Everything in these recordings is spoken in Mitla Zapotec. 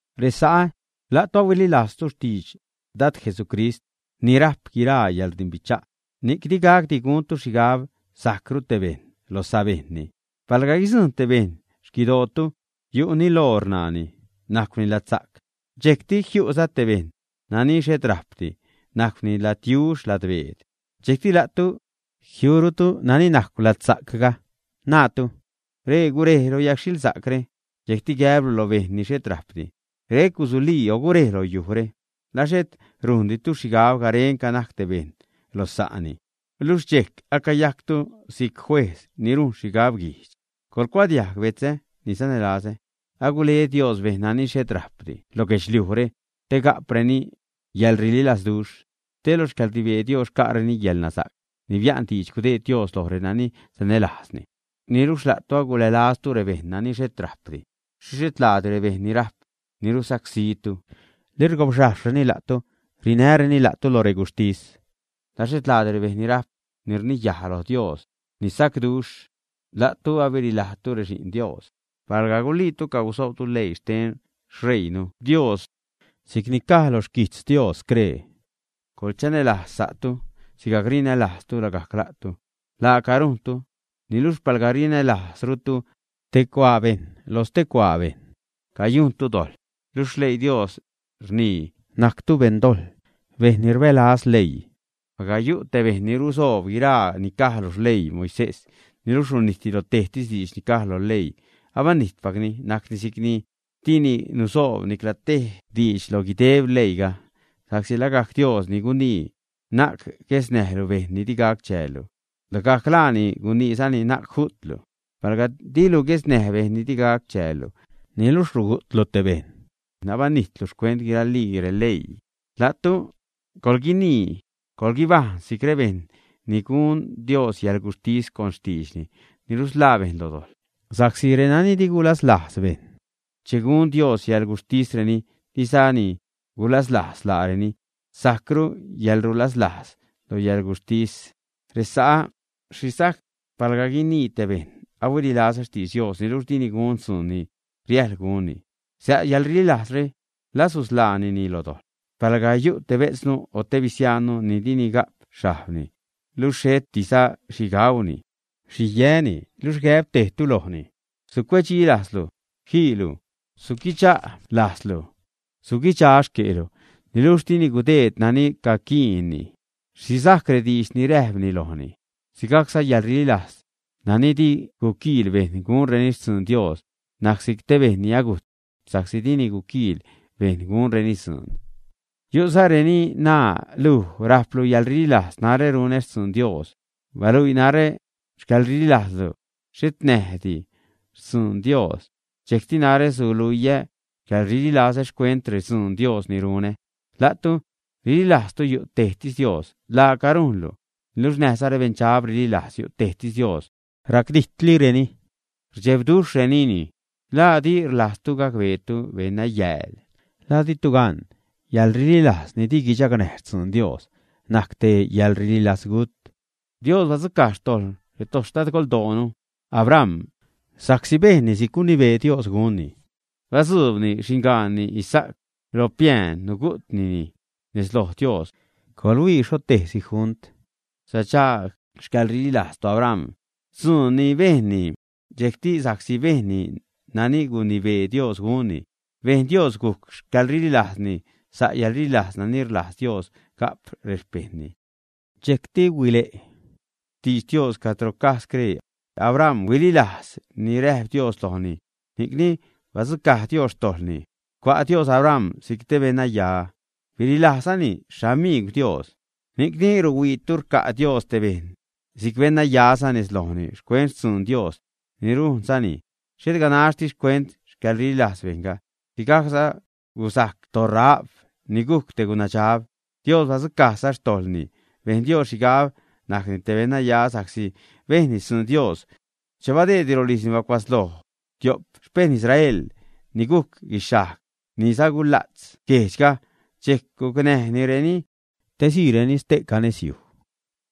Resa'ä, la'tu ahuililajztu xtidx Dad Jesucrist ni rajp guiraa yäḻrdimbicha', ni'c di gacdi guntu xhigab sajcru tej bejṉ lo sabejṉni. Palga guidzujṉ te bejṉ xquidootu yu' niloor ṉaani, najcwni ladsa'c, dxejcti jiu'za te bejṉ nani xhet rajpdi, najcwni ladyujxh, ladbeed, dxejcti la'tu jiurutu nani najcw ladsa'cga, naatu: “Ree gurej lo yagxhilsa'cre”, dxejcti gäblu lo bejṉ ni xhet rajpdi: “Rec gusulii o gurej lo yujre”, ¿la xhet rujnditu xhigab garenca najc tej bejṉ lo sa'ni, ä? Luxh dxejc acayajctu si'c juejz ni rujn xhigab guijdx. ¡Coḻgucuadiajg, betzä ni sanälazä! Agule Dios bejṉ nani xhet rajpdi lo guedxliujre te ga'preni yäḻrililazduxh, te lo xcäḻrnibee Dios xca'reni xcäḻnasa'c ni bia'n diidx gudeed Dios loj renani sanälajzni. Niluxh la'tu agulälaztu rebejṉ nani xhet rajpdi. ¿Xhixh xhet laadi rebejṉ ni rajp ni rusacsítu, li rgobxhajxhreni la'tu, rinäreni la'tu loj reguxhtis, ä? ¿La xhet laadi rebejṉ ni rajp ni rniyaj loj Dios ni sacduxh? La'tu abirilajtu rexi'n Dios. Palga guliitu cagusoobtu leii xten xṟeiinu Dios, si'cni caj lo xquijtz Dios scree: “Coḻchanälajz sa'tu sigajc rinälajztu lagajc la'tu”, laaca rujntu. Niluxh palga rinälajzrutu tej cuaa bejṉ lo stee cuaa bejṉ, cayujntu dojḻ, luxh xleii Dios rnii najctu beṉ dojḻ, bejṉ ni rbälaz leii. Palga yu' te bejṉ ni rusoob guiraa ni caj lo xleii Moisés, niluxh runijtni lo tejtis diidx ni caj lo leii, abanijtpacni, najcni si'cni dini nusoob nicla tej diidx lo guideb leiiga. Sa'csi lagajc Dios ni gunii: “Na'c guesnäjlu bejṉ ni di gac chäällu”, lagajc laani guniizani: “Na'c ju'tlu.” Palga dilu guesnäj bejṉ ni di gac chäällu, niluxh rugu'tlu te bejṉ, abanijtlu xcuent guiralii releii. La'tu coḻguinii, coḻguibajṉ si'c rebejṉ ni gun Dios yäḻguxhtis con xtiidxni ni rusḻaa bejṉ lo dojḻ. Sa'csi renani di gulaslajz bejṉ, che gun Dios yäḻguxhtisreni, dizani gulaslajz laareni. Sajcru yäḻrulaslajz lo yäḻguxhtis. Resa'ä, ¿xhi sajc palga guinii te bejṉ: “Ahuililazä xtidx Dios”, niluxh dini gun dzuun ni riäjḻ gunni, ä? Sa' yäḻrililajzre, ¿la susḻaanini lo dojḻ, ä? Palga yu' te bejtznu o te bisiajnnu ni dini ga'p xhajbni, luxh xhetiza xhi gauni, xhi yäni, luxh gäb tejtu lojni: “Sucuedxi lajzlu jiilu, suguidxa' lajzlu, suguidxaj xque'lu”, niluxh dini gudeed nani caquiinni, ¿xhi sajc rediidx ni räjpni lojni, ä? Sigajcza yäḻrililajz nani di guquiil bejṉ gunreni xtzuun Dios najc si'c te ni agujt, sa'csi dini guquiil bejṉ gunreni dzuun. Yu'za reni naa: “Luj rajplu yäḻrililajz, narä runä xtzuun Dios; baluii narä xcäḻrililajzlu xhet näjdi xtzuun Dios, dxejcti narä suluiä xcäḻrililazä xcuent rextzuun Dios ni runä.” La'tu rililajztu yu' tejtis Dios. Laaca rujnlu, niluxh näjza rebeṉdxab rililajz yu' tejtis Dios, racdijtlireni, rdxebduxhrenini. ¿La di rlajztu gacbeetu, beṉnayääl? ¿La ditu gan, yäḻrililajz ni di guichagnäj xtzuun Dios najc te yäḻrililazgut? Dios badzucaj xtojḻ toxtadgoldoonu Abram sa'csi bejnni si'c gunibee Dios gunni, che badzuubni xingaanni Isa'c lo piään, nugu'tnini nez lo Dios. Coḻhuii xho tejsi junt sadxaag xcäḻrililajz toAbram dzuun ni bejnni, dxejcti sa'csi bejnni nani gunibee Dios gunni, bejn Dios gujc xcäḻrililajzni sa' yälrililajz nani rlajz Dios ga'p rexpejṉni. Dxejcti huile' xtidx Dios cadro caj scree: “Abram huililajz ni räjp Dios lojni, ni'cni badzucaj Dios xtojḻni, cua' Dios Abram si'c te beṉnaya.” Birilajzani “xamiigw Dios.” Ni'cni ruhuiitu rca' Dios te bejṉ si'c beṉnaya nez lojni xcuent xtzuun Dios ni rujnzani, xhet ganaxtis xcuent xcäḻrililajz bejṉga. Sigajcza gusajc toRahab, ni gujc te gunadxab. Dios badzucajza xtojḻni, bejn Dios xhigab najcni te beṉnaya sa'csi bejnni xtzuun Dios che badeedni rolijzni bacua'tzloj tio'p xpejṉ Israel ni gujc guixhajg ni sagula'tz guejdxga, dxejc gucnäjnireni te siireni ste'ca nez yuj.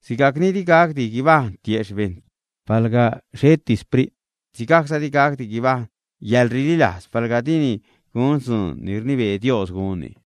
Sigajc ni di gacdi guibajṉ tiejxh bejṉ palga xheti sprit, sigajcza di gacdi guibajṉ yäḻrililajz palga dini gun dzuun ni rnibee Dios gunni.